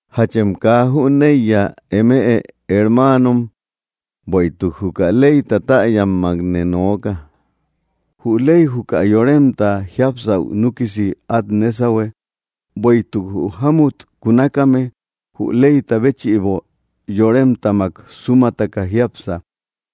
¿Jachem kaa jüneiya, eme hermaanom? Bueïtuk juka leyta täyammakne nooka. Jü ley juka yoremta jiápsaü núkisi át nésahue. Bueïtuk jü jámut kunakame jü leyta béchïbo yoremtamak súmataka jiápsa,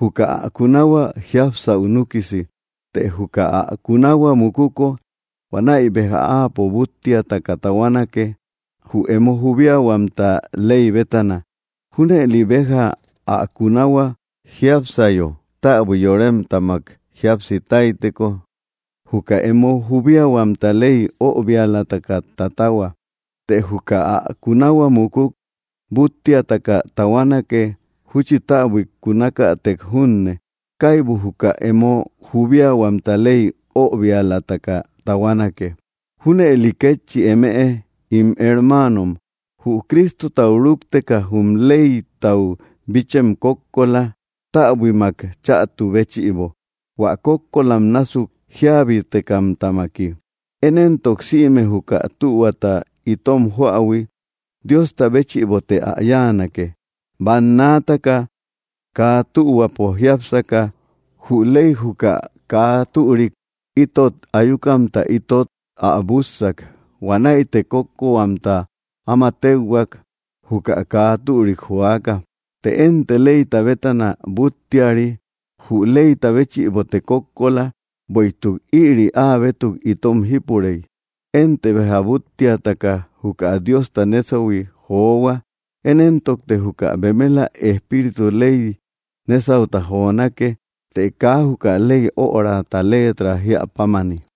juka ä kunahua jiápsaü núkisi. Të juka ä kunahua mukuko, huanäi béja áapo búttiataka tahuanake, jü emo jubiahuamta ley bétana. Júnëli béja, ä kunahua jiápsayo täbui yoremtamak jíapsi táyteko, juka emo jubiahuamta ley öbialataka tatahua. Të juka ä kunahua mukuk, búttiataka tahuanake, júchi täbuik kunakätek junne, kaibu juka emo jubiahuamta ley öbialataka tahuanake. Júnëli kétchi eme, ín hermaanom, jü Cristotau rúkteka jum leytau bichem kókkola, täbuimak chätu béchïbo, hua kókkolam násuk jíabitekamtamaki. Én éntok sïme juka tühuata itom joähui, Diosta béchïbote ä yáanake. Bannaataka kaa tühuapo jiápsaka, jü ley juka kaa türik itot ayukamta itot ä bússak. Huanäite kókkohuamta áma téuhuak, juka kaa türik joaka. Të énte leyta bétana búttiari. Jü leyta béchïbote kókkola, bueïtuk ïri áa bétuk itom jípurey. Énte béja búttiataka juka Diosta nésahui johua. Én éntokte juka bemela Espíritu ley nésauta jonake, te kaa juka ley örata leetra jíä pámani.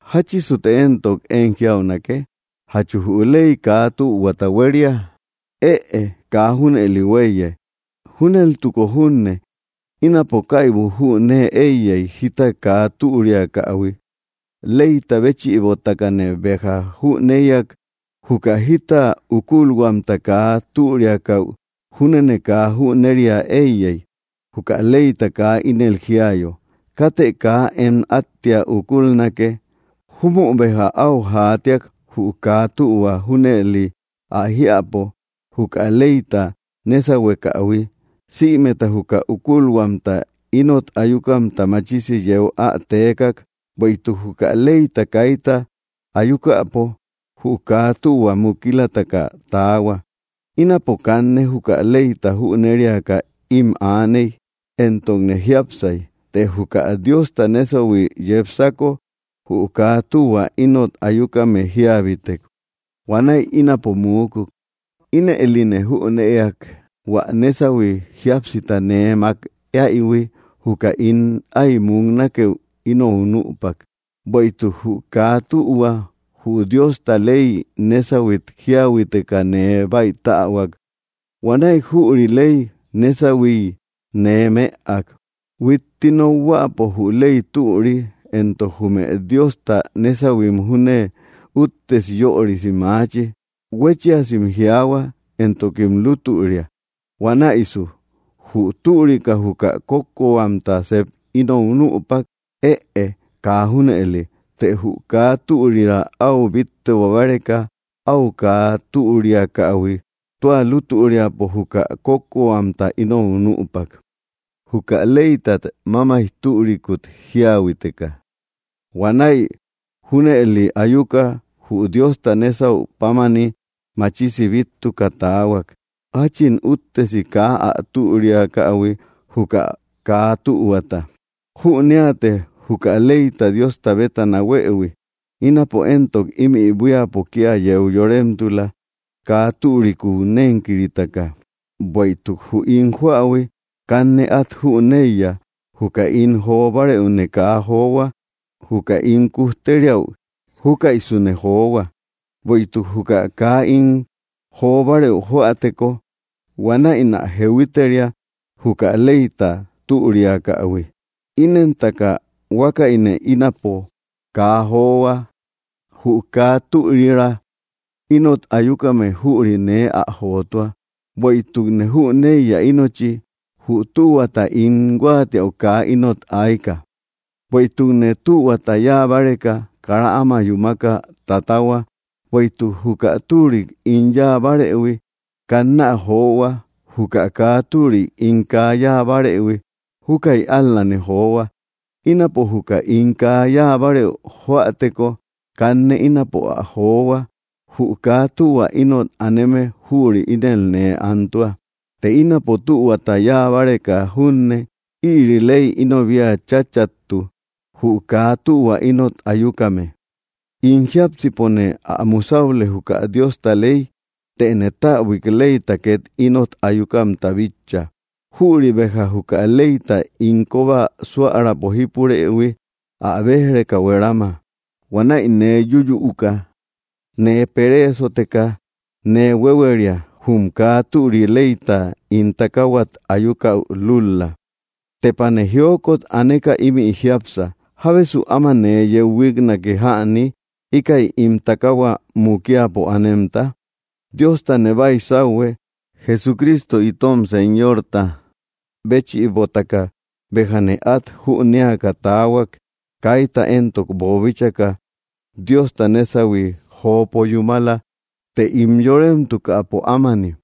¿Jáchisute éntok én jiaunake? ¿Jachu jü ley kaa tühuata huéria? ¡Ëe! Kaa junëli huéiye. Júneltuko junne, ínapo kaibu jünee éiyey, jita kaa türiakähui leyta béchïbotakane béja jüneïak. Juka jita ukulhuamta kaa türiakaü júnene kaa jüneria éiyey, juka leyta kaa ínel jiayo: “Katë kaa em áttia ukulnake.” Júmü béja áu jaatiak jü kaa tühua junëli ä jiäpo juka leyta nésahuekähui, sïmeta juka ukulhuamta ínot ayukamta machisi yeu ä teekak. Bueïtuk juka leyta kaita ayukäpo, jü kaa tühua mukilataka taahua. Ínapo kanne juka leyta jüneriaka ím aaney, entokne jiápsay. Të juka Diosta nésahui yepsako, jü kaa tühua ínot ayukame jíabitek. Huanäi ínapo muukuk. Ínëline jünëak: hua nésahui jíapsita nee mák éaïhui, juka ín áy muknakeü ínou nüpak. Bueïtuk jü kaa tühua, jü Diosta ley nésahuit jíahuiteka, nee báitähuak. Huanäi jüri ley nésahuiy nee mëak. Huitti nokhuäpo jü ley türi, entok jume Diosta nésahuim júne úttesi yörisi maachi, huéchiasim jiaahua, entokim lútüria. Huanäisu, ¿jü türika juka kókkohuamta sep ínou nüpak? ¡Ëe! ¡Kaa junëli! Të jü kaa türira áu bíttebo báreka áu kaa türiakähui tua lutüriapo, juka kókkohuamta ínou nüpak, juka leytat mámaij türikut jíahuiteka. Huanäi junëli ayuka, jü Diosta nésau pámani, machisi bíttuka taahuak, jáchin úttesi kaa ä türiakähui juka kaa tühuata. Jüneate, juka leyta Diosta bétana huëhui. Ínapo éntok ímï buíapo kía yeu yoremtula, kaa türikuu nénkiritaka. Bueïtuk jü ín joähui, kanne át jüneiya. Juka ín jo bárëune kaa johua. Juka ín kujteriäu, júkäisune johua. Bueïtuk juka kaa ín jo bárëu joäteko, huanäinä jehuiteria, juka leyta türiakähui. Inentaka huákäine ínapo kaa johua. Jü kaa türira ínot ayukame, jüri nee ä jotua. Bueïtukne jüneiya ínochi, jü tühua ín huáatiäu kaa ínot ayka. Bueïtukne tühuata yáa báreka, kara áma yúmaka tatahua. Bueïtuk juka türik ín yáa barëhui, kannä johua; juka kaa türik ín kaa yáa bárëhui, júkäi ál‑lane johua. Ínapo juka ín kaa yáa bárëu joäteko, kanne ínapo ä johua; jü kaa tühua ínot aneme, jüri ínel nee antua. Të ínapo tühuata yáa báreka junne, ïri ley ínobia cháchätu, jü kaa tühua ínot ayukame. In jiápsipone ä musaüle, juka Diosta ley, tëne täbuik leyta két ínot ayukamta bitcha. Jüri béja juka leyta ín kóba súärapo jípurëhui, ä béj‑reka huerama. Huanäi nee yúyüuka nee pereesoteka nee huéhueria, jum kaa türi leyta ín takaahuat ayukäu lúl‑la. ¡Tepane jiokot aneka ímï jiápsa! ¿Jábesu áma nee yeu huíknake jäni, íkäi ín takaahua mukiapo anemta? Diostane baisauhue, Jesucristo itom Señorta béchïbotaka béjane át jünéaka taahuak. Kaita éntok boobíchaka Diosta nésahuine jopo yúmala, të ín yoremtukäpo ámani,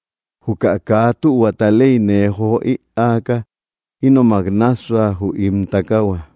juka kaa tühuata ley nee jo ïaaka ínomak nássua, jü ín takaahua.